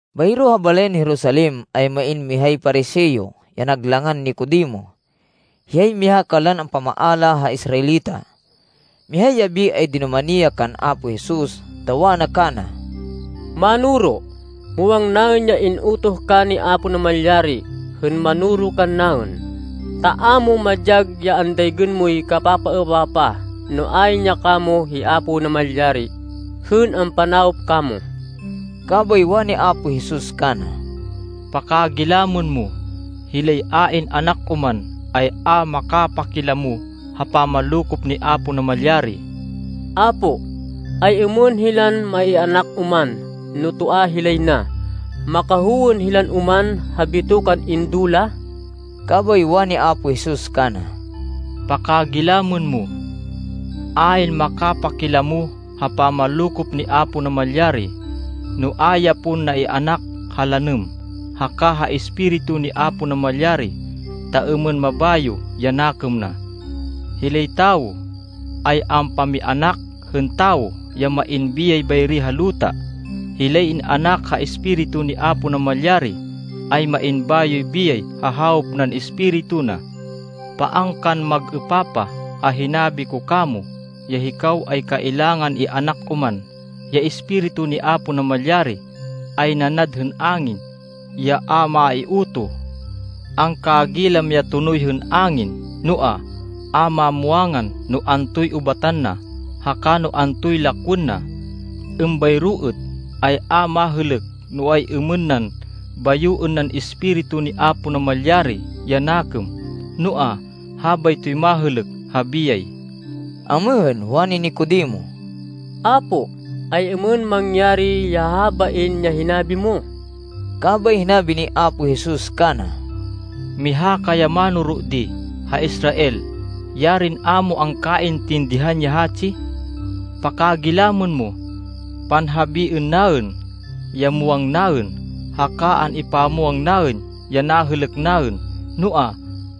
Bayro ha balayan Jerusalem, ay main mihay Pariseo, ya nag langan Nicodemo. Hiyay miha kanlan ampamaala ha Israelita. Mihay yabi, ay dinumani ya kan Apo Jesus, ta wana kana, “Mánoro, muwang naên ya in-utoh ka ni Apo Namalyari, hên manoro kannaên, ta a mo madyag ya andaygên moy kapapaêpapah, no ayn ya kamo hi Apo Namalyari, hên ampanawop kamo.” Kabay wani Apo Jesus kana, “Pakagilamên mo, hilay a in-anak oman, ay a makapakilamo ha pamanlokop ni Apo Namalyari.” “Apo, ay-êmên hilan ma-ianak oman no toa hilay na? Makahowên hilan oman ha bitokan indo la?” Kabay wani Apo Jesus kana, “Pakagilamên mo. Ayn makapakilamo ha pamanlokop ni Apo Namalyari, no a ya pon na-ianak ha lanêm, haka ha Espiritu ni Apo Namalyari ta êmên mabayo ya nakêm na. Hilay tawo ay ampamianak hên tawo ya main biyay bayri ha luta. Hilay in-anak ha Espiritu ni Apo Namalyari, ay main bayoy biyay ha hawop nan Espiritu na. Paan kan mag-êpapah ha hinabi ko kamo, ya ‘Hikaw ay kailangan ianak oman.’ Ya Espiritu ni Apo Namalyari ay nanad hên angin, ya a maiutoh. Angkagilam ya tonoy hên angin. Noa, a mamwangan no antoy ubatan na, haka no antoy lakwên na. Êmbayro êt, ay a mahêlêk no ay-êmên nan bayoên nan Espiritu ni Apo Namalyari ya nakêm, noa, habaytoy mahêlêk ha biyay.” Amêhên, wani Nicodemo, “Apo, ay-êmên mangyari ya habain ya hinabi mo?” Kabay hinabi ni Apo Jesus kana, “Miha ka ya mánoro di ha Israel. Yarin a mo angkaintindihan ya hatsi. Pakagilamên mo. Panhabiên naên ya muwang naên, haka an-ipamwang naên ya nahêlêk naên. Noa,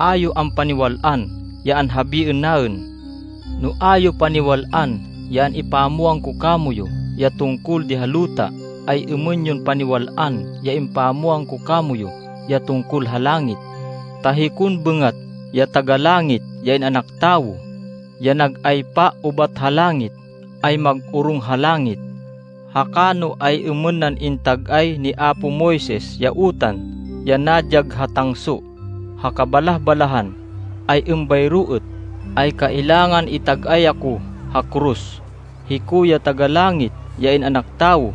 a yo ampaniwal-an ya anhabiên naên. No, a yo paniwal-an ya impamwang ko kamoyu, ya tungkol di ha luta, ay-êmên yon paniwal-an ya ipamwang ko kamoyu ya tungkol ha langit! Ta hikon bêngat, ya Taga-Langit, ya In-anak Tawo, ya nag-aypa ubat ha langit, ay mag-orong ha langit. “Haka no ay-êmên nan intag-ay ni apo Moises ya utan, ya nadyag ha tangso, ha kabalah-balahan, ay êmbayro êt, ay kailangan itag-ay ako ha koros, hiko, ya Taga-Langit, ya In-anak Tawo.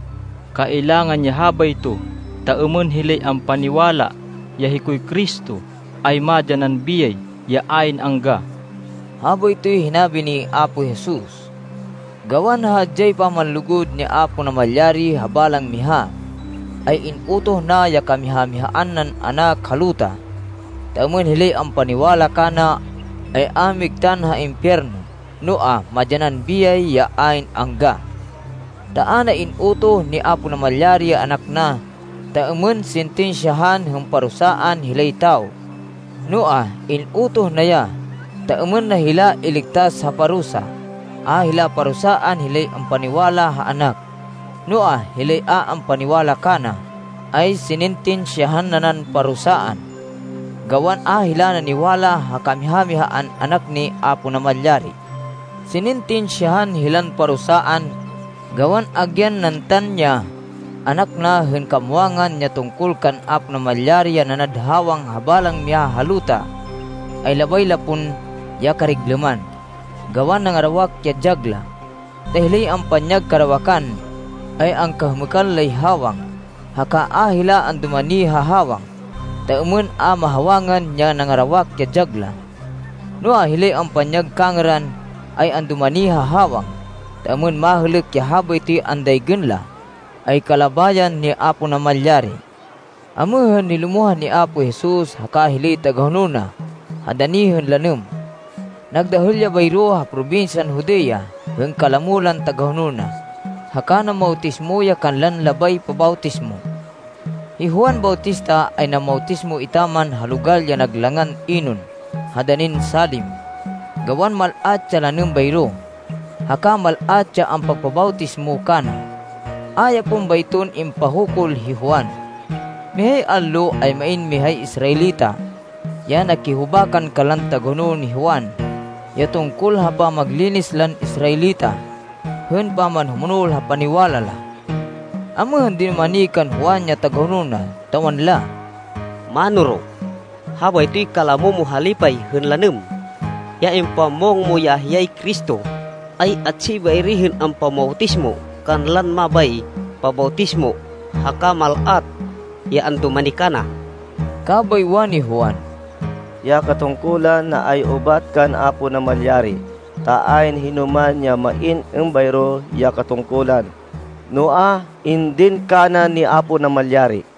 Kailangan ya habayto, ta êmên hilay ampaniwala ya hikoy Cristo, ay madyanan biyay ya ayn angga.” Habaytoy hinabi ni Apo Jesus. Gawan ha hadyay pamanlugud ni Apo Namalyari ha balang miha, ay in-utoh na ya kamiha-mihaan nan Anak ha luta, ta êmên hilay ampaniwala kana, ay a migtan ha impiyerno, noa, madyanan biyay ya ayn angga. Ta a na in-utoh ni Apo Namalyari ya Anak na, ta êmên sintinsyahan hên parusaan hilay tawo. Noa, in-utoh na ya ta êmên na hila iligtas ha parusa. A hila parusaan hilay ampaniwala ha Anak. Noa, hilay a ampaniwala kana, ay sinintinsyahan nanan parusaan, gawan a hila naniwala ha kamiha-mihaan Anak ni Apo Namalyari. Sinintinsyahan hilan parusaan, gawan agyan nantan ya Anak na hên kamwangan ya tungkol kan Apo Namalyari ya nanad hawang ha balang miha ha luta, ay labay la pon ya kariglêman, gawan nangarawak ya dyag la. Ta hilay ampanyag karawakan, ay angkahêmêkan lay hawang, haka a hila andumani ha hawang, ta êmên a mahawangan ya nangarawak ya dyag la. Noa, hilay ampanyag kangêran, ay andumani ha hawang, ta êmên mahêlêk ya habaytoy andaygên la, ay kalabayan ni Apo Namalyari. Amêhên, nilumohan hi Apo Jesus haka hilay tagahonol na ha dani hên lanêm. Nagdahêl ya bayro ha probinsyan Judea hên kalamo lan tagahonol na, haka namawtismo ya kanlan labay pabawtismo. Hi Juan Bautista ay namawtismo etaman ha logal ya nag langan Enon ha danin Salim, gawan mal-at ya lanêm bayro, haka mal-at ya ampagpabawtismo kana. A ya pon bayton impahukul hi Juan. Mihay allo, ay main mihay Israelita, ya nakihubakan kanlan tagahonol ni Juan, ya tungkol ha pamaglinis lan Israelita, hên pamanhumonol ha paniwala la. Amêhên, dinumani kan Juan ya tagahonol na, ta wanla, “Mánoro, habaytoy kalamo mo ha lipay hên lanêm, ya impamwang mo ya hiyay Cristo, ay atsi bayri hên ampamawtismo kanlan mabay pabawtismo. Haka mal-at ya andumani kana.” Kabay wani Juan, “Ya katungkulan na ay ubat kan Apo Namalyari, ta ayn hinoman ya main êmbayro ya katungkulan no a indin kana ni Apo Namalyari.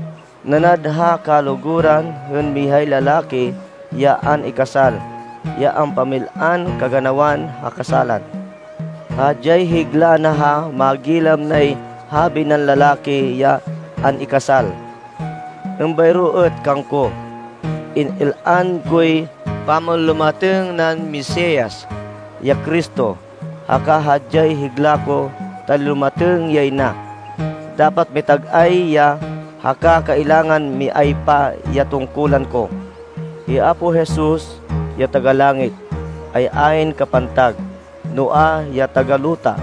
Nanad ha kaluguran hên mihay lalaki ya an-ikasal, ya ampamil-an kaganawan ha kasálan. Hadyay higla na ha magilam nay habi nan lalaki ya an-ikasal. Êmbayro êt kangko. In-il-an koy pamanlumatêng nan Mesias, ya Cristo, haka hadyay higla ko ta nilumatêng yay na. Dapat mitag-ay ya, haka kailangan miaypa ya tungkulan ko.” Hi Apo Jesus, ya taga-langit, ay ayn kapantag. Noa, ya taga-luta,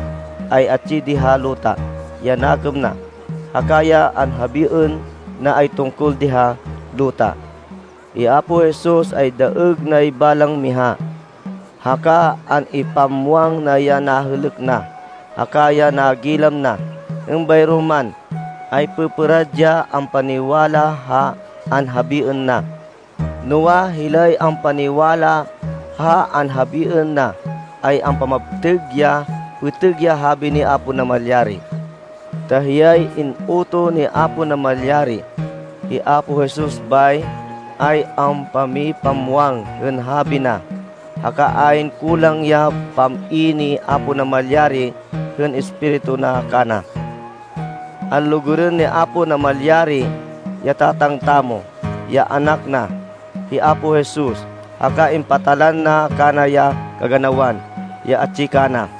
ay atsi di ha luta ya nakêm na, haka ya anhabiên na ay tungkol di ha luta. Hi Apo Jesus ay daêg nay balang miha. Haka an-ipamwang na ya nahêlêk na, haka ya nagilam na, êmbayro man, ay pêpêrad ya ampaniwala ha anhabiên na. Noa, hilay ampaniwala ha anhabiên na, ay ampamaptêg ya pêtêg ya habi ni Apo Namalyari. Ta hiyay in-utoh ni Apo Namalyari, hi Apo Jesus bay, ay ampamipamwang hên habi na. Haka ayn kulang ya pam-i ni Apo Namalyari hên Espiritu na kana. Anlugurên ni Apo Namalyari, ya Tatang tamo, ya Anak na, hi Apo Jesus. Haka impatalan na kana ya kaganawan ya atsi kana.